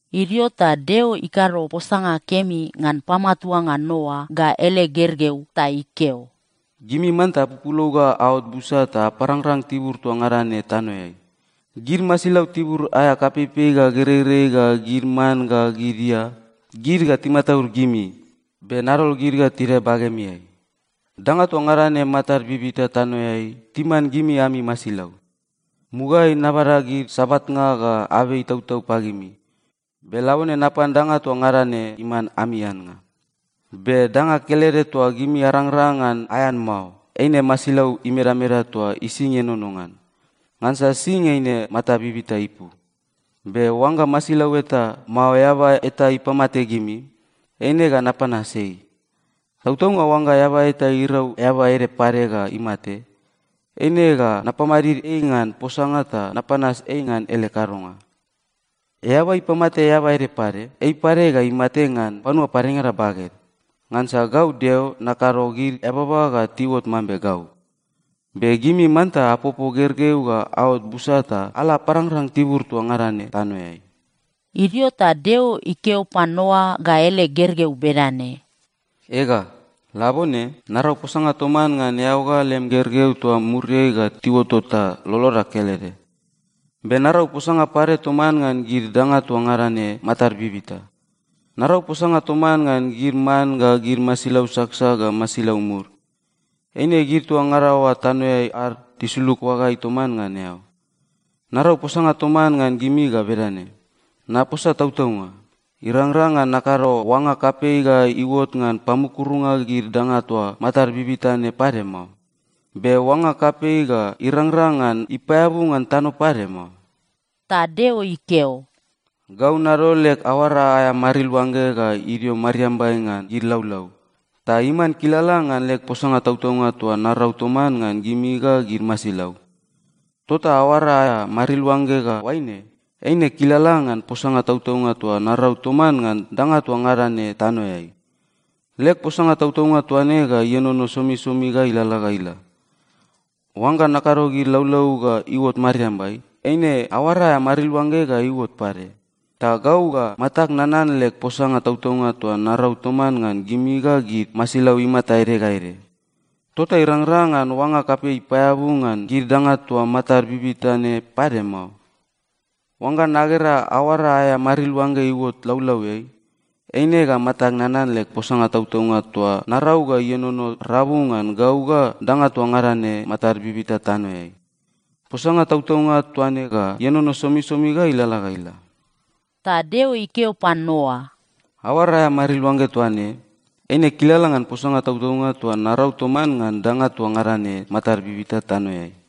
Idio ta Deo ikado posanga kemi ngan pamatuanga Noa ga ele gergeu ta ikeo, “Gimi manta apupulou ga aot busa ta aparangrang tibur toa ngada ne tanoeai. Gid masilau tibur aea kapeipei ga gereirei ga gid man ga gid ia, gid ga timataud gimi, be nadol gid ga tidae bagemiai. Danga toa ngada ne matad bibita tanoeai timan gimi ami masilau. Mugaeai nabada gid sabatnga ga abei itautau pagimi, be labone napan danga toa ngada ne iman ami annga. “Be danga kelede toa gimi arangrang ngan aean mao, eine masilau imedameda toa ising ienono ngan. Ngansa sing eine mata bibita ipu. Be oangga masilau eta, mao eaba eta ipamate gimi, eine ga napanas ei. Tautaunga oangga eaba eta irau eaba ede pade ga imate, eine ga napamadid ei ngan posanga ta napanas ei ngan ele kadonga. “Eaba ipamate eaba ede pade, ei pade ga imate ngan panua padengada baged, ngansa gau Deo nakado gid eababa ga tiuot mambe gau. Be gimi manta apopo gergeu ga aot busa ta ala aparangrang tibur toa ngada ne tanoeai.” Idio ta Deo ikeo pan Noa ga ele gergeu bedane, “Ega, labone, narau posanga toman ngan eao ga lem gergeu toa muriai ga tiuotot ta loloda kelede. Be narau posanga pade toman ngan gid danga toa ngada ne matad bibita. Narau posanga toman ngan gid man ga gid masilau saksak ga masilau mud. Eine gid toa ngada oa tanoeai ad tisulug oagaeai toman ngan eao. Narau posanga toman ngan gimi ga bedane: Naposa tautaunga, irangrang ngan nakado oanga kapei ga iuot ngan pamukurunga gid danga toa matad bibita ne pade mao. Be oanga kapei ga irangrang ngan ipaeabu ngan tano pade mao.” Ta Deo ikeo, “Gau nadol leg aoara aea mariluangge ga idio mariambai ngan gid laulau, ta iman kilala ngan leg posanga tautaunga toa narau toman ngan gimi ga gid masilau. Tota aoara aea mariluangge ga oaine, eine kilala ngan posanga tautaunga toa narau toman ngan danga toa ngada ne tanoeai. Leg posanga tautaunga toa ne ga ienono somisomi ga ilalala ga ila. Oangga nakado gid laulau ga iuot mariambai, eine aoara aea mariluangge ga iuot pade, ta gau ga matag nanan leg posanga tautaunga toa narau toman ngan gimi ga gid masilau imata ede ga ede. Tota irangrang ngan oanga kapei ipaeabu ngan gid danga toa matad bibita ne pade mao. Oangga nagera aoara aea mariluangge iuot laulauiai, eine ga matag nanan leg posanga tautaunga toa narau ga ienono rabu ngan gau ga danga toa ngada ne matad bibita tanoeai. Posanga tautaunga toa ne ga ienono somisomi ga ilalala ga ila.” Ta Deo ikeo pan Noa, “Aoara aea mariluangge toa ne, eine kilala ngan posanga tautaunga toa narau toman ngan danga toa ngada ne matad bibita tanoeai.”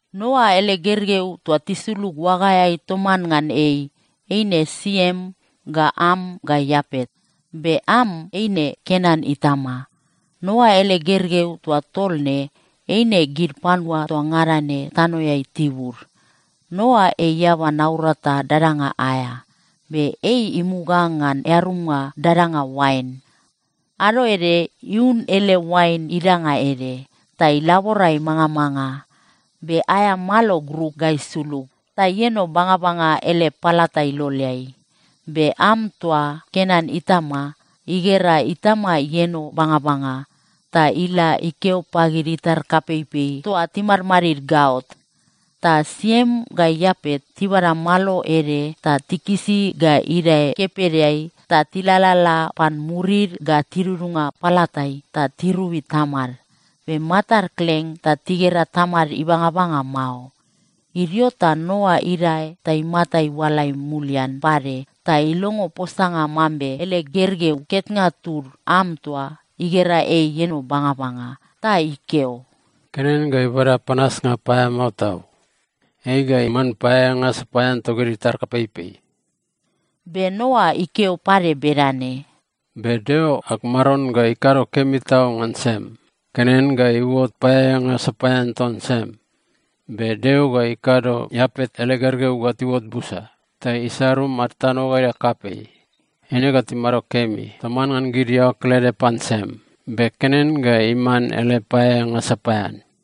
Noa ele gergeu toa tisulug oagaeai toman ngan ei, eine Siem ga Am ga Iapet. Be Am eine Kenan itama. Noa ele gergeu toa tol ne, eine gid panua toa ngada ne tanoeai tibud. Noa ei eaba naurata dadanga aea. Be ei imuga ngan earumnga dadanga oain. Ado ede iun ele oain idanga ede, ta ilabora imangamanga. Be aea malo gruk ga isulug ta ieno bangabanga ele palata iloleai. Be Am toa, Kenan itama, igera itama ieno bangabanga, ta ila ikeo pagid itar kapeipei toa timadmadid gaot. Ta Siem ga Iapet tibada malo ede ta tikisi ga idae kepedeai ta tilalala pan murid ga tidudunga palatai ta tirobi tamad. Be matad kleng ta tigera tamad ibangabanga mao. Idio ta Noa idae ta imata iualai mulian pade ta ilongo posanga mambe ele gergeu ketnga tud, Am toa, igera ei ieno bangabanga. Ta ikeo, “Kenan ga ibada panasnga paeamao tau! Ei ga iman paeaeanga sapaean togid itar kapeipei.” Be Noa ikeo pade bedane, “Be Deo ag Maron ga ikado kemi tau ngan Siem! Kenan ga iuot paeaeanga sapaean ton Siem. Be Deo ga ikado Iapet ele gergeu ga tiuot busa ta isarung ad tano ga ila kapei. Eine ga timado kemi toman ngan gid iaoa kelede pan Siem. Be Kenan ga iman ele paeaeanga sapaean.”